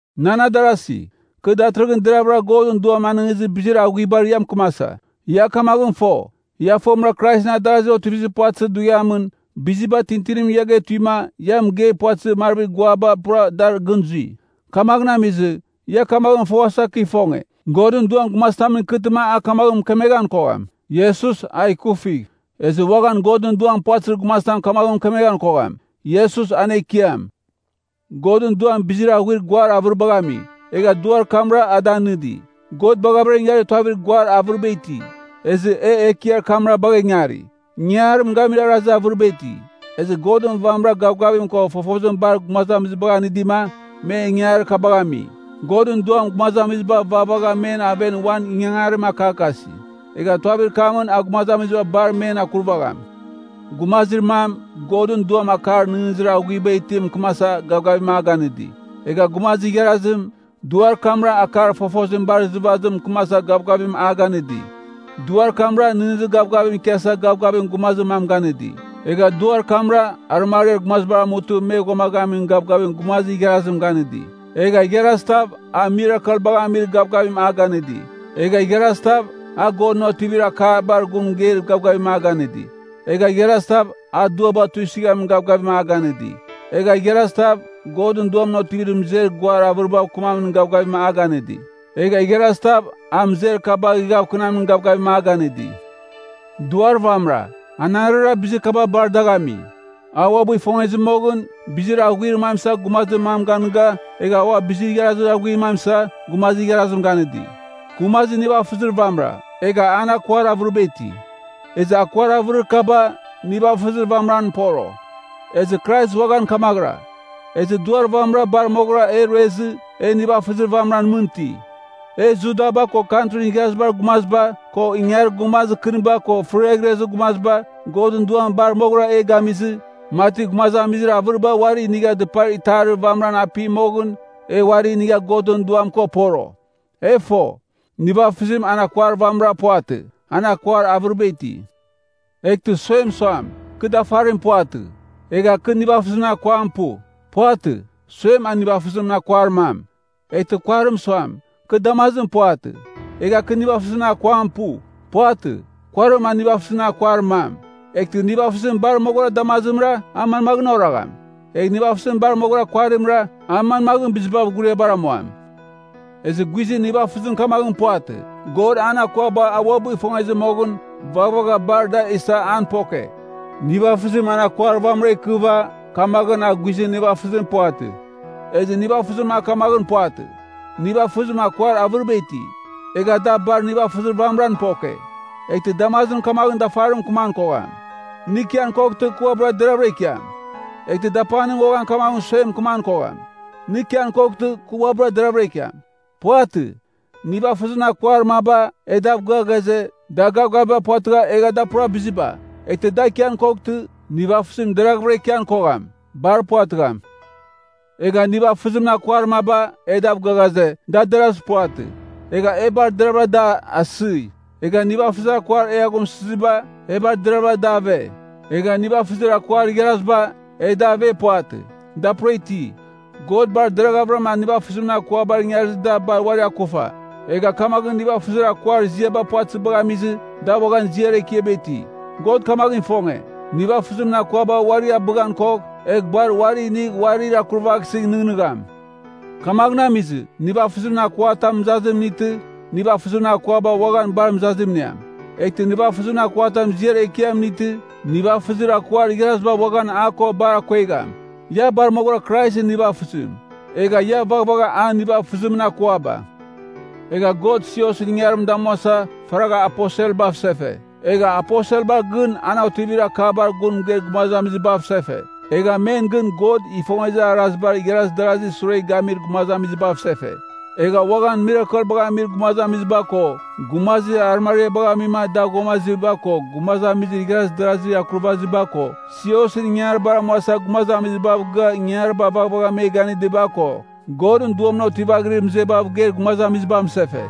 Nan adarasi, kɨ datɨrɨghɨn deravɨra Godɨn Duam anɨngizir bizir aghuibar ia mɨkɨmasa. Ia kamaghɨn fo, ia fomɨra Kraisɨn adarazir otivizir puvatɨzir dughiamɨn, biziba tintinimɨn ia getuima, ia mɨgei puvatɨzir marvir guar kaba pura dar gɨn zui. Kamaghɨn amizɨ, ia kamaghɨn foghasa kɨ ifonge, Godɨn Duam gumazitamɨn ikɨtɨma a kamaghɨn mɨkemeghan kogham, “Iesus, a ikufigh.” Ezɨ uaghan Godɨn Duam puvatɨzir gumazitam kamaghɨn mɨkemeghan kogham, “Iesus, an Ekiam.” Godɨn Duam bizir aghuir guar avɨribagh ami, egha Duar kamra ada nɨdi. God bagha ingarir tuavir guar avɨriba iti, ezɨ e Ekiar kamra bagha ingari. Ingangarim gamir arazarazir avɨriba iti, ezɨ Godɨn vamɨrara gavgavim ko fofozim bar gumazamizibagh anɨdima, me ingangarir kabagh ami. Godɨn Duam gumazamiziba vaghvagha men aven uan ingangarim akakasi, egh tuavir kamɨn a gumazamiziba bar men akurvagham. Gumazir mam, Godɨn Duam akar nɨghnɨzir aghuiba itim mɨkɨmasa gavgavim a ganɨdi. Egha gumazir igharazim, Duar kamra akar fofozim bar izɨvazim mɨkɨmasa gavgavim a ganɨdi. Duar kamra, nɨghnɨzir gavgavim ikiasa gavgavim gumazir mam ganɨdi. Egha Duar kamra, arɨmariar gumaziba amutɨ, me ghuamaghamin gavgavim gumazir igharazim ganɨdi. Egha igharazitav, a mirakelbagh amir gavgavim a ganɨdi. Egha igharazitav, a Godɨn otivir akabar gun mɨgeir gavgavim a ganɨdi. Egha igharazitav, a duaba tuisɨghamin gavgavim a ganɨdi. Egha igharazitav, Godɨn Duamɨn otivir mɨzer guar avɨribav kɨmamin gavgavim a ganɨdi. Egha igharazitav, a mɨzer kabagh ighavkɨnamin gavgavim a ganɨdi. Duar vamɨra, anarɨra bizir kaba bar dagh ami. A uabɨ ifongezɨ moghɨn, bizir aghuarir mam isa gumazir mam ganɨga, egha ua bizir igharazir aghuir mam isa, gumazir igharazim ganɨdi. Gumazir nivafɨzir vamɨra, egha an akuar avɨriba iti. Ezɨ akuar avɨrir kaba, nivafɨzir vamɨran poro. Ezɨ Krais uaghan kamaghɨra. Ezɨ, Duar vamɨra bar moghɨra e ruezɨ, e nivafɨzir vamɨran mɨn iti. E Judaba ko Kantrin Igharazibar Gumaziba, ko ingangarir gumazir kɨniba ko fɨriaghrezir gumaziba, Godɨn Duam bar moghɨra e gamizɨ, mati gumazamizir avɨriba uari inigha dɨpar itarir vamɨran api moghɨn, e uari inigha Godɨn Duam ko poro. E fo, nivafɨzim an akuar vamɨra puvatɨ, an akuar avɨriba iti. Eghtɨ suem suam, “Kɨ dafarim puvatɨ, egha kɨ nivafɨzimɨn akuam pu,” puvatɨ, suem a nivafɨzimɨn akuar mam. Eghtɨ kuarim suam, “Kɨ damazim puvatɨ, egha kɨ nivafɨzimɨn akuam pu,” puvatɨ, kuarim a nivafɨzimɨn akuar mam. Eghtɨ nivafɨzim bar moghɨra damazimra, a manmaghɨn oragham? Egh nivafɨzim bar moghɨra kuarimra, a manmaghɨn bizibav ghuriabar amuan? Ezɨ guizɨn nivafɨzim kamaghɨn puvatɨ. God an akuaba a uabɨ ifongezɨ moghɨn, vaghavagha bar da isa an poke. Nivafɨzim an akuar vamɨra ikɨva, kamaghɨn a guizɨn nivafɨzim puvatɨ. Ezɨ nivafɨzim a kamaghɨn puvatɨ. Nivafɨzim akuar avɨriba iti, egha da bar nivafɨzir vamɨran poke. Eghtɨ damazim kamaghɨn dafarimɨn mɨkɨman kogham, “Nɨ ikian koghtɨ, kɨ uabɨra deravɨra ikiam.” Eghtɨ dapanim uaghan kamaghɨn suem mɨkɨman kogham, “Nɨ ikian koghtɨ, kɨ uabɨra deravɨra ikiam.” Puvatɨ. Nivafɨzimɨn akuar maba, e dav gɨa ghaze, da gavgaviba puvatɨgha egha da pura biziba, eghtɨ da ikian koghtɨ, nivafɨzim deraghvɨra ikian kogham. Bar puvatɨgham. Egha nivafɨzimɨn akuar maba, e dav gɨa ghaze, da derazir puvatɨ. Egha e bar deravɨra da asɨi. Egha nivafɨzimɨn akuar e aghumsɨziba, e bar deravɨra da ave. Egha nivafɨzir akuar igharaziba, e da ave puvatɨ, da pura iti. God bar deravɨra nivafɨzimɨn akuaba ingarizɨ da bar uari akufa. Egha kamaghɨn nivafɨzir akuar iziaba puvatɨzibagh amizɨ, da uaghan ziar ekiaba iti. God kamaghɨn ifonge, nivafɨzimɨn akuaba uari abɨghan kogh, egh bar uari inigh uarir akurvaghsɨ nɨghnɨgham. Kamaghɨn amizɨ, nivafɨzimɨn akuatam mɨzazim inightɨ, nivafɨzimɨn akuaba uaghan bar mɨzazim iniam. Eghtɨ nivafɨzimɨn akuatam ziar ekiam inightɨ, nivafɨzir akuar igharaziba uaghan a ko bar akongegham. Ia bar moghɨra Kraisɨn nivafɨzim. Egha ia vaghavagh an nivafɨzimɨn akuaba. Egha God siosɨn ingangarim damuasa, faragha aposelbav sefe, egha aposelba gɨn an otivir akabar gun mɨgeir gumazamizibav sefe, egha men gɨn God ifongezir arazibar igharaz darazir sure gamir gumazamizibav sefe. Egha uaghan mirakelbagh amir gumazamiziba ko, gumazir arɨmariabagh amima, da ghuamaziba ko, gumazamizir igharaz darazir akurvaziba ko, siosɨn ingangaribar amuasa gumazamizibav gɨa ingangariba vaghvagh me ganɨdiba ko, Godɨn Duamɨn otivaghirir mɨzebav geir gumazamizibav sefe.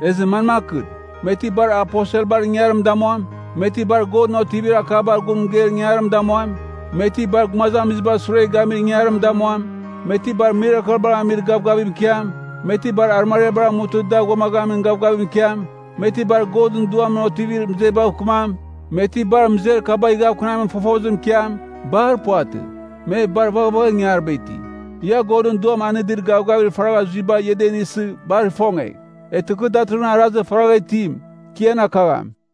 Ezɨ manmakɨn? Me ti bar aposelbar ingangarim damuam? Me ti bar Godɨn otivir akabar gun mɨgeir ingangarim damuam? Me ti bar gumazamizibar sure gamir ingangarim damuam? Me ti bar mirakelbagh amir gavgavim ikiam? Me ti bar arɨmariabar amutɨ da ghuamaghamin gavgavim ikiam? Me ti bar Godɨn Duamɨn otivaghirir mɨzebav kɨmam? Me ti bar mɨzer kabagh ighavkɨnamin fofozim ikiam? Bar puvatɨ, me bar vaghavagha ingangariba iti. Ia Godɨn Duam anɨdir gavgavir faragha zuiba ia da inisɨ, bar ifongegh. Eghtɨ kɨ datɨrɨghɨn arazir faraghavɨra itim, kɨ ian akagham.